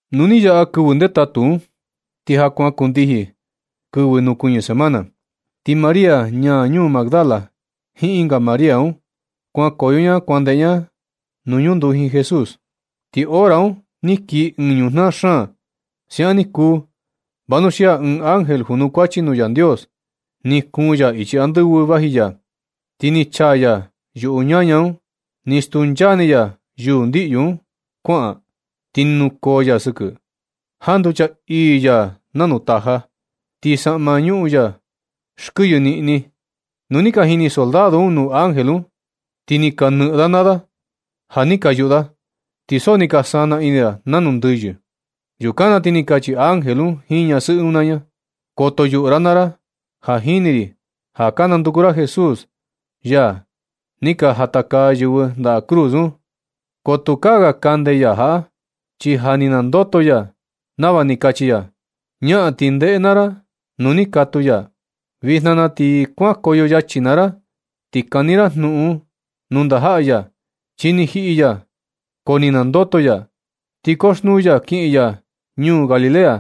Nu ni yaꞌa kɨvɨ ndetatu un, ti ja kuan kundijin kɨvɨ nukuñɨ semana, ti María ñaa ñuu Magdala, jiin ɨnga María un, kuankoyo ña kuan ndeꞌe ña nuu ñunduji Jesús. Ti hora un ni kii ɨɨn ñujnaa xaan. Siaꞌan ni kuu, vanuxia ɨɨn ángel junukuachi nuu Yandios, ni kuun ya ichi andɨvɨ vaji ya, ti ni chaa ya yuꞌu ñaña un, ni stuncha ni ya yuu ndiꞌyu un kuaꞌan, ti ni nukoo ya sɨkɨ. Janducha ii ya nanu taja, ti saꞌma ñuꞌun ya xkɨyɨ niꞌni. Nu ni ka jini soldado un nuu ángel un, ti ni ka nɨꞌɨn da naa da ja ni ka yuꞌu da, ti so ni ka sana ini da nanu ndɨyɨ. Yukan na ti ni kachi ángel un jiin ñasɨꞌɨ un naa ña: ―Koto yuꞌu ra naa ra. Ja jini ri ja ka nanduku ra Jesús, yaa ni ka jatakaa yɨvɨ ndaꞌa cruz un. Ko tukaa ga kande ya jaꞌa, chi ja ni nandoto ya nava ni kachi ya. Ñaꞌan ti ndeꞌe naa ra nuu ni katuu ya. Vijna na ti kuankoyo yachi naa ra, ti kani ra jnuꞌun nuu ndajaꞌa ya: “Chi ni jiꞌi ya ko ja ni nandoto ya, ti koxnuu ya kiꞌin ya ñuu Galilea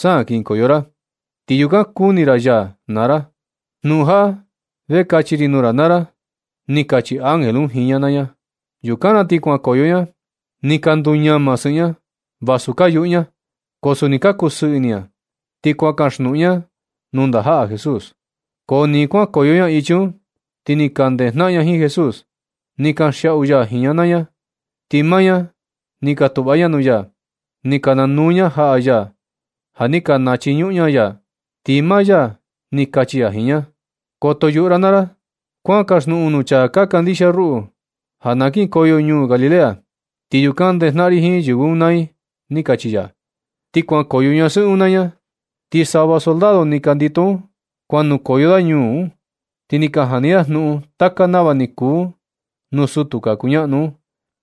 sa kinkoyo ra. Ti yukan nakuni ra ya naa ra.” Jnuꞌun jaꞌa vee kachi ri nuu ra naa ra ―ni kachi ángel un jiin ña naa ña. Yukan na ti kuankoyo ña, ni ka nduñama sɨꞌɨ ña vasu ka yuꞌu ña, ko suni ka kusɨɨ ini ña. Ti kuan kaxnuꞌun ña nuu ndajaꞌa Jesús. Ko ni kuankoyo ña ichi un, ti ni ka ndejnaꞌan ña jiin Jesús, ni kanxiaꞌu ya jiin ña naa ña. Ti maa ña ni ka tuꞌva ña nuu ya, ni ka nanuu ña jaꞌa ya ja ni ka nachiñuꞌun ña ya. Ti maa ya ni kachi ya jiin ña: ―Koto yuꞌu ra naa ra. Kuan kaxjnuꞌun nuu chaa ka kandixia ruꞌu ja na kinkoyo ñuu Galilea, ti yukan ndejnaꞌan ri jiin yɨvɨ un naa i ―ni kachi ya. Ni kuankoyo ñasɨꞌɨ un naa ña, ti sava soldado ni ka ndito un, kuan nukoyo da ñuu un, ti ni ka jani da jnuꞌun taka nava ni kuu un nuu sutu ka kuñaꞌnu un.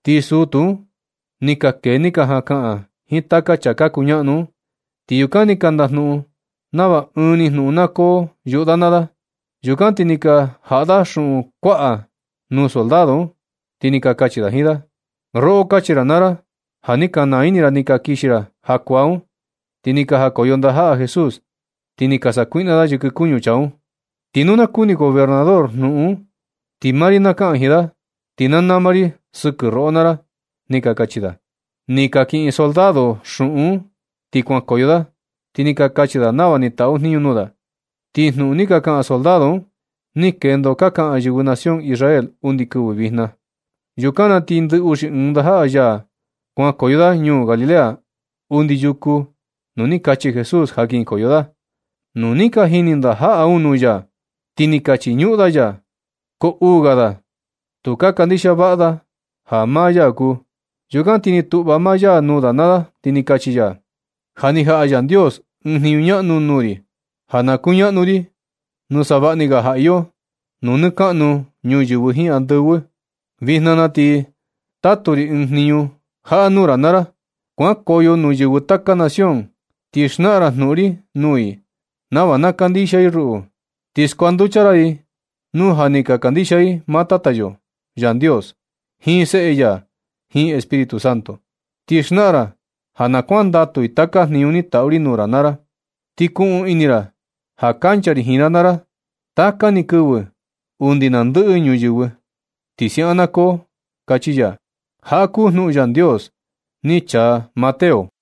Ti sutu un ni ka kee ni ka jaꞌan kaꞌan jiin taka chaa ka kuñaꞌnu un, ti yukan ni ka ndajnuꞌun nava ɨɨn ni jnuꞌun na koo yuꞌu da naa da. Yukan ti ni ka jaꞌa da xuꞌun kuaꞌa nuu soldado un, ti ni ka kachi jiin da: ―Roꞌo, kachi ra naa ra ja ni ka naa ini ra ni ka kixi ra jakuaa un, ti ni jakoyo ndajaꞌa Jesús, ti ni ka sakuiꞌna da yɨkɨ kuñu chaa un. Ti nu na kuni gobernador jnuꞌun un, ti maa ri na kaꞌan jiin da, ti na nama ri sɨkɨ roꞌo naa ra ―ni ka kachi da. Ni ka kiꞌin soldado un xuꞌun un ti kuankoyo da, ti ni ka kachi da nava ni taꞌu jniñu nuu da. Ti jnuꞌun ni ka kaꞌan soldado un, ni kendo ka kaꞌan yɨvɨ nación Israel undi kɨvɨ vijna. Yukan na ti ndɨ uxi ɨɨn ndajaꞌa ya un kuan nukoyo da ñuu Galilea, undi yuku nuu ni kachi Jesús ja kinkoyo da. Nu ni ka jini ndajaꞌa un nuu ya, ti ni ka nachiñuꞌun da ya. Ko uu ga da, tu ka kandixia vaꞌa da ja maa ya kuu. Yukan ni tuꞌva maa ya nuu da naa da, ti ni kachi ya: ―Ja ni jaꞌa Yandios ɨɨn jniñu ñaꞌnu nuu ri ja na kuñaꞌnu ri nuu savaꞌa ni ga ja iyo nuu nɨ kaꞌnu ñuyɨvɨ jiin andɨvɨ. Vijna na ti na tatu ri ɨɨn jniñu jaꞌa nuu ra naa ra. Kuankoyo nuu yɨvɨ taka nación, ti xnaꞌan ra jnuꞌun ri nuu i nava na kandixia i ruꞌu. Ti skuanducha ra i nu ja ni ka kandixia ndaa i maa Tata yo Yandios, jiin Seꞌe ya, jiin Espíritu Santo. Ti xnaꞌan ra ja na kuandatu i taka jniñu ni taꞌu ri nuu ra naa ra. Ti kuꞌun ini ra ja kancha ri jiin ra naa ra taka ni kɨvɨ undi na ndɨꞌɨ ñuyɨvɨ. Ti siaꞌan na koo ―kachi ya. Jaꞌa kuu jnuꞌun Yandios ni chaa Mateo.